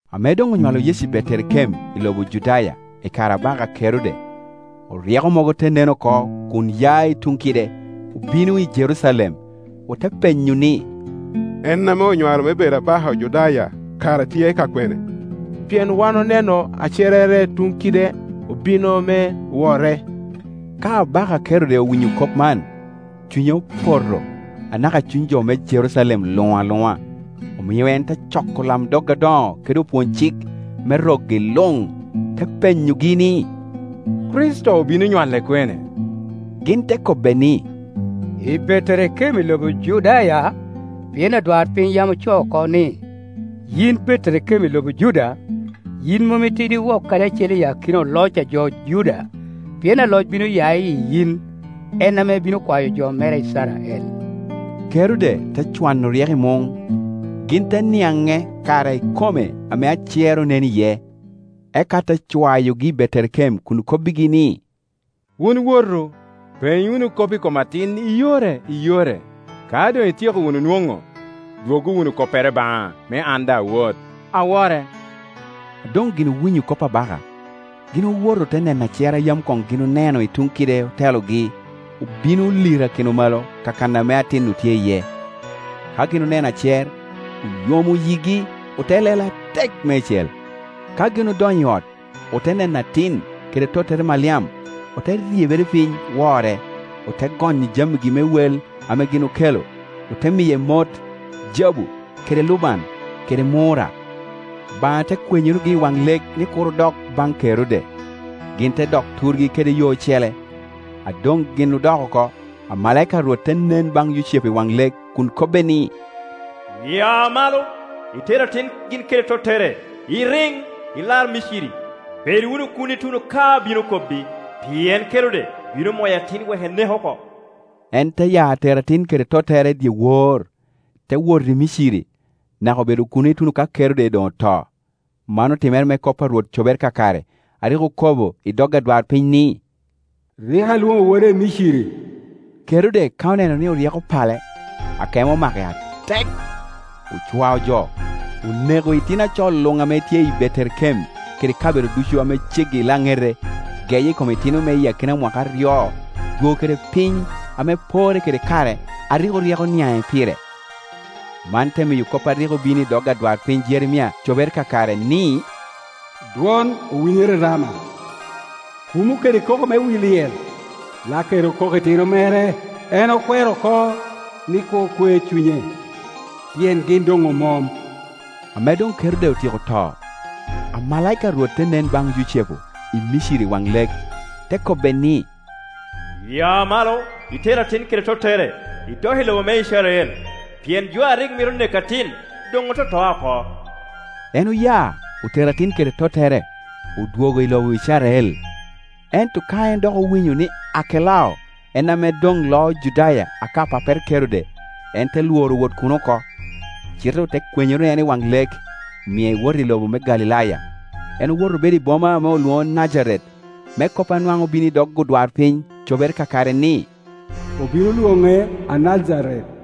Ame doŋ onywalo Yecu i Beterekem i lobo Judaya i kare abaka Kerode, oryeko mogo te nen oko kun ya i tuŋ kide, obino i Jerucalem. Ote penyo ni, “En ame onywalo me bedo abaka Ojudaya kara tye ka kwene? Pien wan oneno acerrere tuŋ kide, obino me wore.” Ka abaka Kerode owinyo kop man, cunye opoto, anaka cuny jo me Jerucalem luŋ aluŋa; omio en te coko olamdog adoŋo kede opwony-cik me rokgi luŋ, te penyogi ni, “Kricito obino nywale kwene?” Gin te kobbe ni, “I Beterekem i lobo Judaya, pien adwarpiny yam ocoo oko ni, ‘Yin Beterekem i lobo Juda, yin mom itidi wok kadi acel i akina oloc a jo Juda; pien aloc bino ya i yin, en ame bino kwayo jo mera Icrael.’” Kerode te cwano oryeko i muŋ, gin te niaŋe kare ikome ame acer onen iye. Eka te cwayogi i Beterekem kun kobbigi ni, “Wun wotu, peny wunu kop i kom atin i yore i yore; ka doŋ ityeko wunu nwoŋo, dwoggo wunu koppere baŋa, me an daŋ awot, awore.” A doŋ gin owinyo kop abaka, gin owoto ote neno acer a yam koŋ gin oneno i tuŋ kide otelogi, obino olirakino malo kakan ame atin-nu tye iye. Ka gin oneno acer, oyomo yigi, ote lelo atek meicel. Ka gin odonyo i ot, ote neno atin, kede tottere Maliam, ote ryebere piny, wore, ote gonyo jamigi me wel ame gin okelo, ote miye mot, jabu kede luban kede murra. Obaŋa te kwenyorogi i waŋ lek ni kur odok baŋ Kerode, gin te dok turgi deke yo ocele. A doŋ gin odok oko, amalaika a Rwok te nen baŋ Yucepu i waŋ lek kun kobbe ni, “Ya malo, iter atin gin kede tottere, iriŋ, ilar Miciri, bed wunu kuno ituno ka abino kobbi, pien Kerode bino moyo atin wek enek oko.” En te ya tero at in kede tottere dyewor, te wot i Miciri; naka obedo kuno ituno ka Kerode doŋ oto. Man otimere me kop a Rwot cobere kakare a rik okobo i dog adwarpiny ni, “Rik alwono woda i Miciri.” Kerode ka oneno ni oryeko opale, akemo omake atek; ocwao jo, oneko itino a co luŋ ame tye i Beterekem kede kabedo ducu ame ceggi i laŋete geye i kom itino me akina mwaka aryo, dwogo kede piny, ame porre kede kare a rik oryeko oniaŋe pire. Man te miyo kop a rik obino i dog adwarpiny Jeremia cobere kakare ni, “Dwon owinyere i Rama, kumo kede koko me wi lyel; Lakeri okoko itino mere. En okwero oko ni kur kwe cunye, pien gin doŋ omom.” Ame doŋ Kerode otyeko to, amalaika a Rwot te nen baŋ Yucepu i Miciri i waŋ lek, te kobbe ni, “Ya malo iter atin kede tottere, idok i lobo me Icrael, pien jo a rik mito neko atin doŋ ototoa oko.” En oya, otero atin kede tottere, odwogo i lobo Icrael. Ento ka en dok owinyo ni Arkelao en ame doŋ loo Judaya aka pappere Kerode, en te lworo wot kuno oko, cite ote kwenyoro en i waŋ lek, omie ewoto i lobo me Galilaya. En owoto obedo i boma ame olwoŋo Najaret, me kop a nwaŋ obino i dog odwarpiny cobere kakare ni, “Obino lwoŋe Anajaret.”